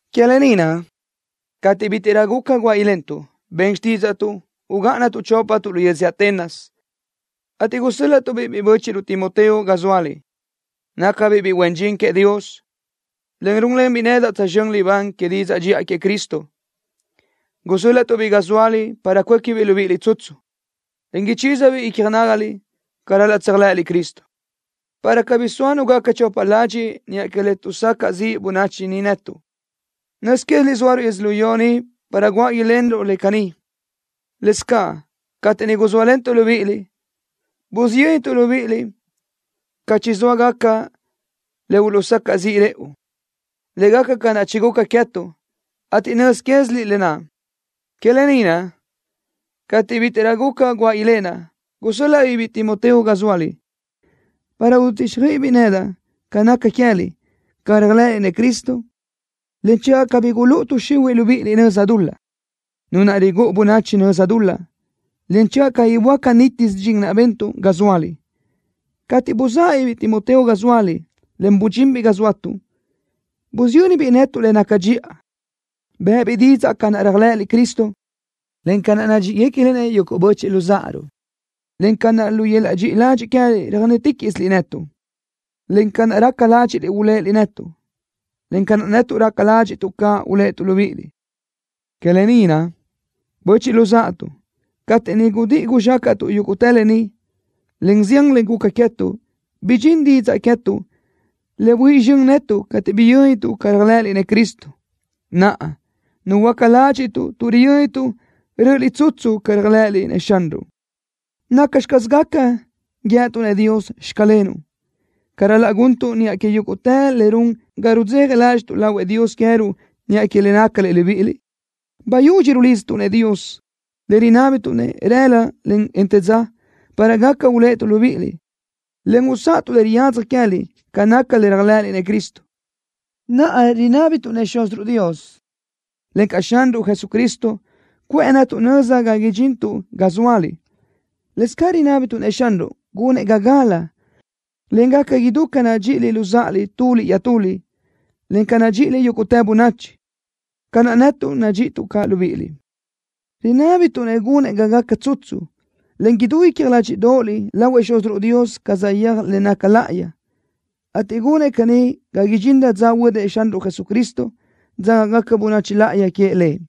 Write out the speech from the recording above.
Que lë ni naʼ, cateʼ bítiʼrö guca guáʼ ilentuʼ, ben xtídzaʼtuʼ ugáʼanatuʼ chópatuʼ lu yödzö Atenas, ateʼ gusö́l-laʼtuʼ-biʼ biʼi bö́chiʼruʼ, Timoteo ga zóaliʼ. Nácabiʼ biʼi huen dxin queëʼ Dios, en rúnlenbiʼ nedaʼ tsözxö́n libán que didzaʼ dxiʼa queëʼ Cristo. Gusö́l-laʼtuʼ-biʼ ga zóaliʼ para cuéquibiʼ libíʼiliʼ tsutsu, en ichízabiʼ icja nágaliʼ ca ral-laʼ tséajlëʼëliʼ Cristo, para cabí soa nu gaca chopa ladxiʼ niʼa que le tuʼsacaʼ ziʼ bönachi ni netuʼ. Nöz quéziliʼ zóaruʼ yödzölió ni para guáʼ ilenruʼ le caní. Lëscaʼ cateʼ niʼ guzóalentuʼ libíʼiliʼ, busiyöntuʼ libíʼiliʼ ca chizóa gaca le uluʼsacaʼ ziʼ rëʼu, le gaca ca naʼ chiguca queë́tuʼ, ateʼ nöz quéziliʼ lë naʼ. Que lë ni naʼ, cateʼ bítiʼrö guca guáʼ ilenaʼ, gusö́l-laʼa-biʼ biʼi Timoteo ga zóaliʼ, para ududíxjöiʼibiʼ nedaʼ ca naca queë́liʼ ca réajlëʼëliʼ-nëʼ Cristo, en channö cabí gulúʼu tuʼ xihuiʼ libíʼiliʼ nöza dul-laʼ, nu naʼ rigúʼu bönachi nöza dul-laʼ, en channö cabí böáca nítisö dxin naʼ bentuʼ ga zóaliʼ. Cateʼ buzáʼabiʼ biʼi Timoteo ga zóaliʼ, en budxinbiʼ ga zóatuʼ, busiyönbiʼ netuʼ le naca dxiʼa. Bë́ʼëbiʼ didzaʼ ca naʼ réajlëʼëliʼ Cristo, en ca naʼ nadxíʼigacaliʼ-nëʼ yuguʼ böchiʼ luzáʼaruʼ, en ca naʼ, lu yöl-laʼ dxiʼi ladxiʼ queë́liʼ röjnéticaʼsiliʼ netuʼ, encaʼ ca naʼ raca ládxiʼliʼ uléʼeliʼ netuʼ, ca naʼ netuʼ raca ládxiʼtuʼ caʼ uléʼetuʼ libíʼiliʼ. Que lë ni naʼ, böchiʼ luzáʼatuʼ, cateʼ niʼ gudíʼi guzxácaʼtuʼ yúguʼtë lë ni, en zián le guca queë́tuʼ, bidxín didzaʼ queë́tuʼ le buíʼi zxön netuʼ cateʼ biyö́nituʼ ca réajlëʼëliʼ-nëʼ Cristo. Naʼa, nuhuöáca ládxiʼtuʼ tuʼ riyö́nituʼ rö́ʼöliʼ tsutsu ca réajlëʼëliʼ-nëʼ Xanruʼ. ¿Nacxi caz gaca guíëtuʼ-nëʼ Dios: “Xclenuʼ” ca ral-laʼ guntuʼ niʼa que yúguʼtë le run ga rudzeja ládxiʼtuʼ lahuëʼ Dios queë́ruʼ niʼa que le nácaliʼ libíʼiliʼ? Bayudxi rulidztuʼ-nëʼ Dios, en rinábituʼ-nëʼ rëla, en të dza para gaca uléʼetuʼ libíʼiliʼ, en usáʼatuʼ le riyadzaj queë́liʼ ca naca le réajlëʼëliʼ-nëʼ Cristo. Naʼa rinábituʼ-nëʼ Xúziruʼ Dios, encaʼ Xanruʼ Jesucristo, cuʼë netuʼ nöza ga idxintuʼ ga zóaliʼ. Lëscaʼ rinábituʼ-nëʼ Xanruʼ gunëʼ ga gala, en gaca idú ca nadxíʼiliʼ luzáʼaliʼ tuliʼ iaʼtuliʼ, en ca nadxíʼiliʼ yúguʼtë bönachi, ca naʼ netuʼ nadxíʼituʼ caʼ libíʼiliʼ. Rinábituʼ-nëʼ gunëʼ ga gaca tsutsu, en idú dxiʼa icja ládxiʼdoʼoliʼ lahuëʼ Xúziruʼ Dios ca saʼyéaj le naca láʼayi, ateʼ gunëʼ caní ga idxinrö dza huödëʼ Xanruʼ Jesucristo, dzágagaca bönachi láʼayi queëʼ Lëʼ.